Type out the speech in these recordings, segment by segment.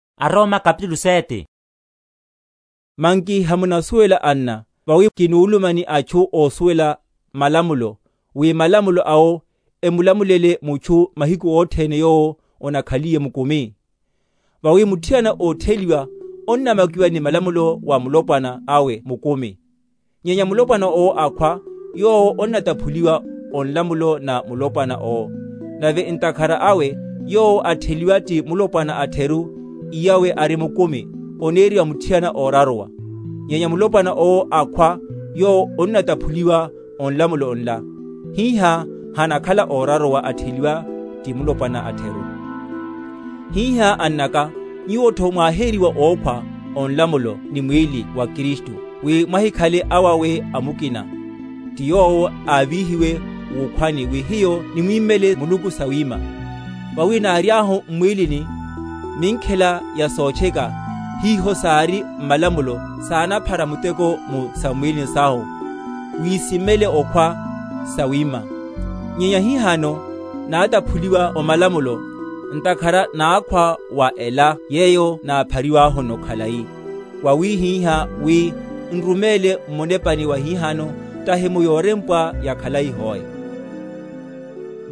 Alipa‐ororomela otheliwa waya ti Kristu. Manki hamunasuwela, anna, vawi kinuluma ni atchu ósuwela malamulo, wi malamulo awo emulamulele mutchu mahiku othene yowo onakhaliye mukumi? Vawi muthiana ótheliwa onnamakiwa ni nlamulo wa mulopwana awe mukumi; nyenya mulopwana owo akhwa, yowo onnataphuliwa o nlamulo na mulopwana owo. Nave ntakhara awe, yowo atheliwa ti mulopwana atheru, iyawe ari mukumi, oneriwa muthiana óraruwa; nyenya mulopwana owo akhwa, yowo onnataphuliwa o nlamulo nla; hihá hanakhala óraruwa, atheliwa ti mulopwana atheru. Hihá, annaka, nyuwotho mwáhériwa ókhwa o nlamulo ni mwíli wa Kristu; wi mwahikhale awawe a mukina, ti yowo ávíhiwe wukhwani, wi hiyo nimwímele Muluku sawima. Vawi náriahu m’mwílini, minkhela ya sotcheka, hiho sári m’malamulo, sánaphara muteko mu sam’mwílini sahu, wi simmelo okhwa sawima. Nyenya hihano nátaphuliwa o malamulo, ntakhara nákhwa wa ela yeyo náphariwahuno khalai, wawihihá wi n’ruméle m’munepani wahihano, tahi mu yorempwa yakhalai hoe. Malamulo woniha waya sotcheka.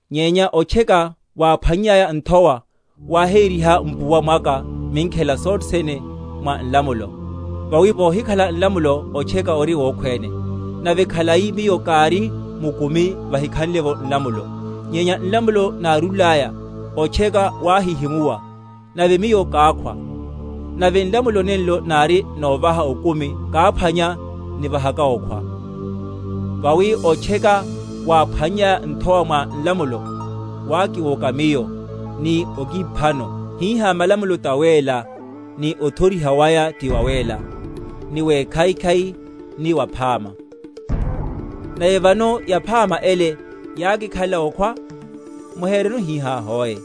nyenya otcheka, wáphwannyaya nthowa, wáhériha mpuwa mwaka minkhela sothe sene mwa malamulo; vawi vohikhala nlamulo otcheka ori wokhwéne. Nave khalai miyo kári mukumi vahikhanle’vo nlamulo; nyenya nlamulo nárúlaya, otcheka wáhihimuwa, nave miyo kákhwa. Nave nlamulo, nenlo nári novaha okumi, káphwanya nivahaka okhwa. Vawi otcheka, wáphwannyaya nthowa mwa nlamulo, wákiwoka miyo, ni okiphano. Hihá malamulo tawéla, ni othoriha waya ti wawéla, ni wekhaikhai, ni waphama. Weteteya mpuwa mwaka. Nave vano yaphama ele yákikhalela okhwa? Muhereno hihá hoe.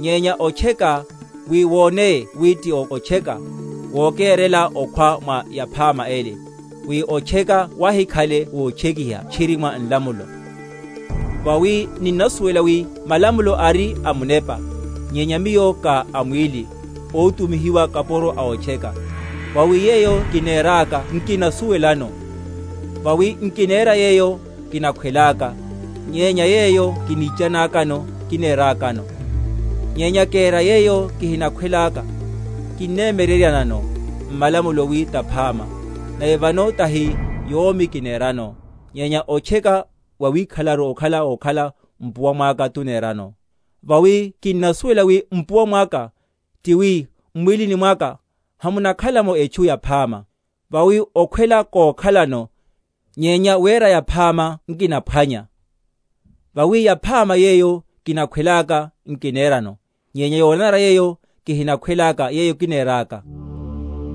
Nyenya otcheka, wi woneye wi ti otcheka, wokérela okhwa mwa yaphama ele; wi otcheka wahikhale wotchekiha tchiri mwa nlamulo. Vawi ninnasuwela wi malamulo ari a munepa; nyenya miyo ka a mwíli, ótumihiwa kapuro a otcheka. Vawi yeyo kineráka nkinasuwelano; vawi nkinera yeyo kinakhwelaka, nyenya yeyo kinichanákano, kinerákano. Nyenya kera yeyo kihinakhwelaka, kinnemyereryanano malamulo wi taphama. Nave vano tahi yomi kinerano, nyenya otcheka wawikhalelaru okhala wokhala mpuwa mwaka tunerano. Vawi kinnasuwela wi mpuwa mwaka, ti wi m’mwílini mwaka, hamunakhala’mo etchu yaphama; vawi okhwela kokhalano, nyenya wera yaphama nkinaphwanya. Vawi yaphama yeyo kinakhwelaka, nkinerano; nyenya yonanara yeyo kihinakhwelaka, yeyo kineráka.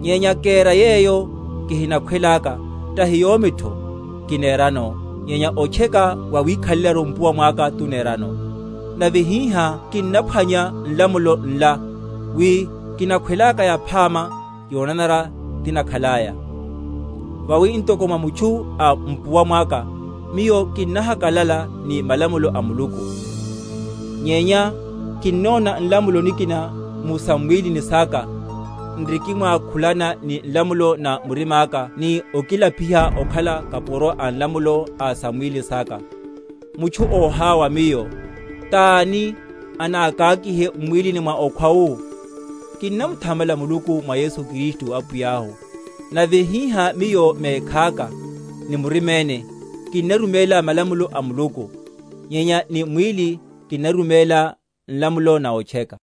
Nyenya kera yeyo kihinakhwelaka, tahi yomitho kinerano, nyenya otcheka wawikhalelaru mpuwa mwaka tunerano. Nave hihá kinnaphwanya nlamulo nla, wi, kinakhwelaka yaphama, yonanara tikhanlaya. Vawi ntoko mwa mutchu a mpuwa mwaka, miyo kinnahakalala ni malamulo a Muluku: nyenya kinnona nlamulo nikina mu sam’mwílini saka, n’rikimwákhulana ni nlamulo na murimaka ni okilapiha okhala kapuro a nlamulo a sam’mwílini saka. Mutchu óháwa miyo; tani anakakihe m’mwílini mwa okhwa wu? Kinnamuthamala Muluku, mwa Yesu Kristu Apwiyahu. Nave hihá miyo mekhaka ni muriméne kinnaruméla malamulo a Muluku; nyenya ni mwíli kinnaruméla nlamulo na otcheka.